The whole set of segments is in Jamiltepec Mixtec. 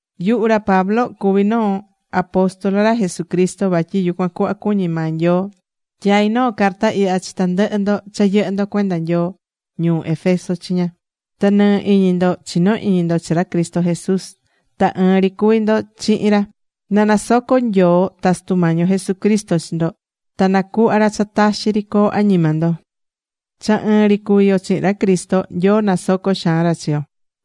Yuhu ra Pablo cuví noo apóstol ra Jesucristo. Vatyi yucuan cuhva cuñí maa Nyoo. Tyaí noo carta ihya chi tandɨhɨ ndo cha yɨhɨ́ ndo cuenda Nyoo ñuu Éfeso chiña, ta nɨɨ́ iñi ndo chinó iñi ndo chi ra Cristo Jesús. Ta ɨɨn ri cuví ndo chihin ra. Na nasoco Nyoo ta Sutu Mañi yo Jesucristo chi ndo. Ta nacuhva ra cha taxi ri coo añima ndo.Cha ɨɨn ri cuvi yo chihin ra Cristo, Nyoo nasocó xaan ra chi yo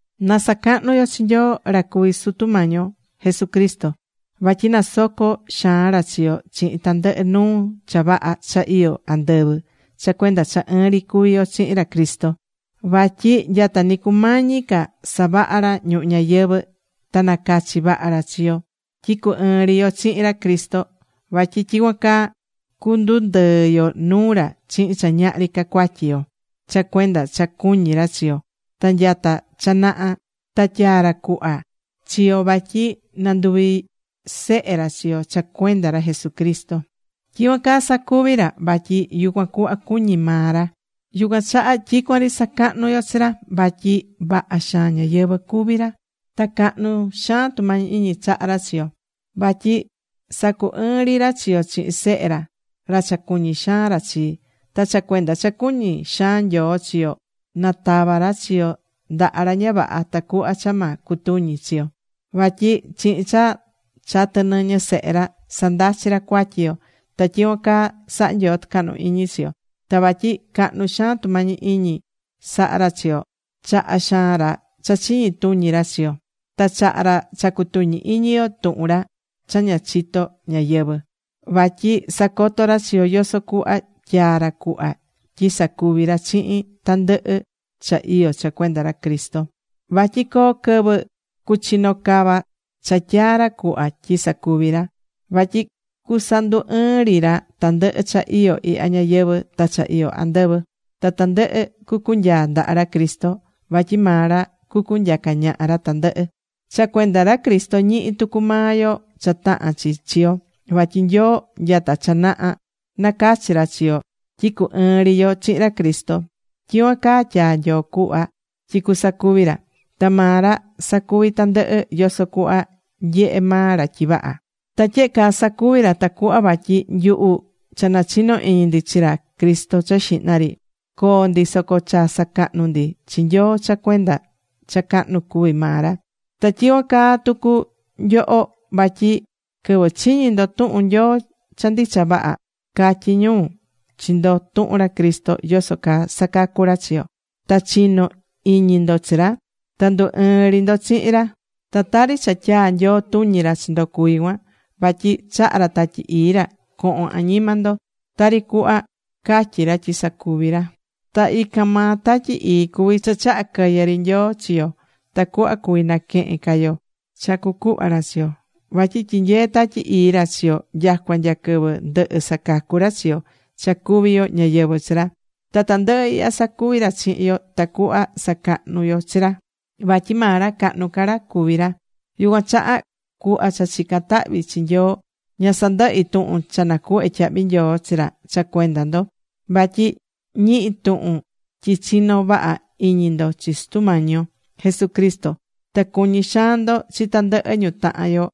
Na sacahnu yo chi Nyoo, ra cuví Sutu Sutu Mañi yo Jesucristo. Vatyi nasocó xaan ra chi yo chihin tandɨhɨ nuu cha vaha cha iyó andɨvɨ cha cuenda cha ɨɨn ri cuví yo chihin ra Cristo. Vatyi nyata ni cumañi ca savaha ra ñuhu ñayɨvɨ̱ ta nacachi̱ vaha ra chi yo tyi cu ɨɨn ri yo chihin ra Cristo. Vatyi tyicuan caa cundundɨɨ yo nuu ra chihin cha ñahri ca cuatyi yo. Cha cuenda cha cuñí ra chi yo, ta nyata cha naha ta tyaa̱ ra cuhva chi yo vatyi nanduvi sehe ra chi yo cha cuenda ra Jesucristo. Tyicuan caa sacuvi̱ ra vatyi yucuan cuhva cuñí maa ra. Yucuan chaha tyicuan ri sacahnú yo chi ra. Vatyi vaha xaan ñáyɨvɨ cuví ra. Ta cahnu xaan tumañi iñi chahá ra chi yo. Vatyi sacu ɨɨ̱n ri ra chi yo chihin Sehe ra, ra cha cuñí xaan ra chi. Ta cha cuenda cha cuñí xaan Nyoo chi yo, natava̱ ra chi yo ndaha ra ña vaha, tacuhva cha ma cutuñi chi yo. Vatyi chihin cha chatɨ̱ nɨñɨ Sehe ra, sandachí ra cuatyi yo. Ta tyicuan caa sahá Nyoo tɨcahnu iñi chi yo. Ta vatyi cahnu xaan tumañi iñi sahá ra chi yo, chahá xaan ra cha chiñi tuñi ra chi yo. Ta chahá ra cha cutuñí iñi yo tuhun ra cha ña chito̱ ñáyɨvɨ. Vatyi sacotó ra chi yo yoso cuhva tyaa̱ ra cuhva tyi sacuvi ra chihin tandɨhɨ cha iyó cha cuenda ra Cristo. Vatyi coo quɨvɨ cuchino cava cha tyaa̱ ra cuhva tyi sacuvi ra. Vatyi cusandu ɨɨn ri ra tandɨhɨ cha iyó ihya ñayɨvɨ̱ ta cha iyó andɨvɨ, ta tandɨhɨ cucunyaa ndaha ra Cristo. Vatyi maa ra cucunyaca ñaha ra tandɨhɨ. Cha cuenda ra Cristo ñihí tucu maa yo cha tahán chi chi yo. Vatyi Nyoo nyata cha naha nacachi̱ ra chi yo tyi cu ɨɨn ri yo chihin ra Cristo. Tyicuan caa tyaa̱ Nyoo cuhva tyi cusacuvi ra. Ta maa ra sacuví tandɨhɨ yoso cuhva nyehé maa ra tyi vaha. Ta tyehe caa sacuvi̱ ra tacuhva vatyi nyuhu cha nachino iñi ndi chi ra Cristo cha xihna ri, coo ndi soco cha sacahnu ndi chi Nyoo cha cuenda cha cahnu cuví maa ra. Ta tyicuan caa tucu nyoho. Vatyi quɨvɨ chiñi̱ ndo tuhun Nyoo cha ndicha vaha, catyi̱ ñu chi ndo tuhun ra Cristo yoso caa sacacú ra chi yo. Ta chino̱ iñi ndo chi ra. Ta ndu ɨɨ̱n ri ndo chihin ra. Ta tari cha tyaa̱ Nyoo tuñi ra chi ndo cuví cuan, vatyi chaha̱ ra Tatyi Ii ra cohon añima ndo, tari cuhva catyi̱ ra tyi sacuvi ra. Ta ican maa Tatyi Ii cuví cha chaha̱ quɨyɨ ri Nyoo chi yo tacuhva cuví naquehen ca yo cha cucuhva ra chi yo. Vatyi tyinyeé Tatyi Ii ra chi yo nyacua nya quɨvɨ ndɨhɨ sacacu ra chi yo, cha cuví yo ñáyɨvɨ chi ra. Ta tandɨhɨ ihya sacuví ra chihin yo tacuhva sacahnu yo chi ra. Vatyi maa ra cahnu ca ra cuví ra. Yucuan chaha, cuhva cha chicán tahvi chi Nyoo, ña sandɨhí tuhun cha nacuhvé tyahvi nyoo chi ra cha cuenda ndo. Vatyi ñihi̱ tuhun tyi chinó vaha iñi ndo chi Sutu Mañi yo Jesucristo. Ta cuñí xaan ndo chi tandɨhɨ ñu tahan yo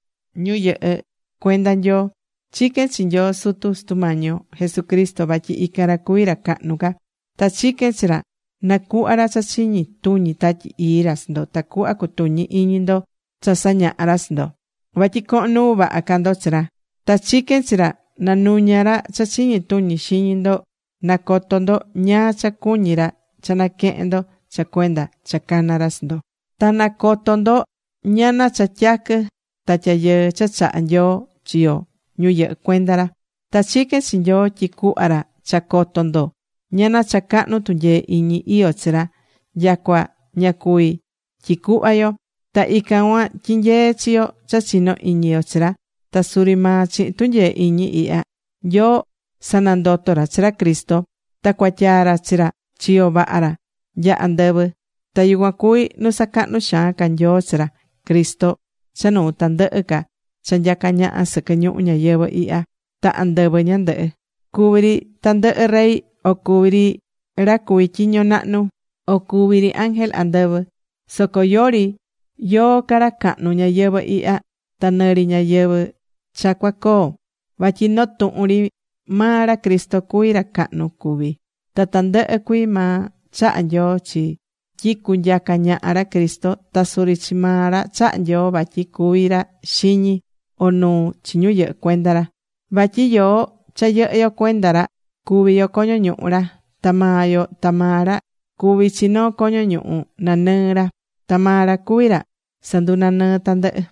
ñu yɨhɨ́ cuenda Nyoo. Chiquén chi Nyoo Sutu Sutu Mañi yo Jesucristo. Vatyi ican ra cuví ra cahnu ca. Ta chiquén chi ra nacuhva ra cha chiñi tuñi Tatyi Ii ra chi ndo, tacuhva cutuñi iñi ndo cha sañahá ra chi ndo. Vatyi cohon nuu vaha ca ndo chi ra. Ta chiquén chi ra, na nuña ra cha chiñi tuñi xiñi ndo, na coto ndo ñáá cha cuñí ra cha naquehen ndo cha cuenda cha cana̱ ra chi ndo. Ta na coto ndo ñana cha tyaquɨ ta tyayɨɨ cha chahá Nyoo chi yo ñu yɨhɨ́ cuenda ra. Ta chiquén chi Nyoo tyi cuhva ra cha coto ndo ñana cha cahnu tunyee iñi iyó chi ra, nyacua ña cuví tyicuhva yo. Ta ican cuan tyinyeé chi yo cha chino iñi yo chi ra. Ta suri maa chihin tunyee iñi ihya Nyoo sanandoto̱ ra chi ra Cristo. Ta cuatyaa ra chi ra chiyo vaha ra nya andɨvɨ. Ta yucuan cuví nu sacahnu̱ xaan ca Nyoo chi ra Cristo cha nuu tandɨhɨ ca cha nyacá ñaha sɨquɨ ñuhu ñayɨvɨ̱ ihya ta andɨvɨ ñandɨhɨ. Cuví ri tandɨhɨ rey, o cuví ri ra cuví tyiño nahnu, o cuvi ri ángel andɨvɨ. Soco yori yóó ca ra cahnu ñayɨvɨ̱ ihya ta nɨrɨ ñayɨvɨ̱ cha cua coo. Vatyi noo tuhun ri maa ra Cristo cuví ra cahnu cuví. Ta tandɨhɨ cuii maa chaha̱ Nyoo tyi cunyaca ñaha ra Cristo. Ta suri chi maa ra chaha̱ Nyoo vatyi cuvi ra xiñi o nuu chi ñu yɨhɨ́ cuenda ra. Vatyi yoó, cha yɨhɨ́ yo cuenda ra, cuví yo coño ñuhu ra. Ta maa yo ta maa ra cuvi chi noo coño ñuhu nanɨɨ ra. Ta maa ra cuví ra sandunanɨɨ́ tandɨhɨ.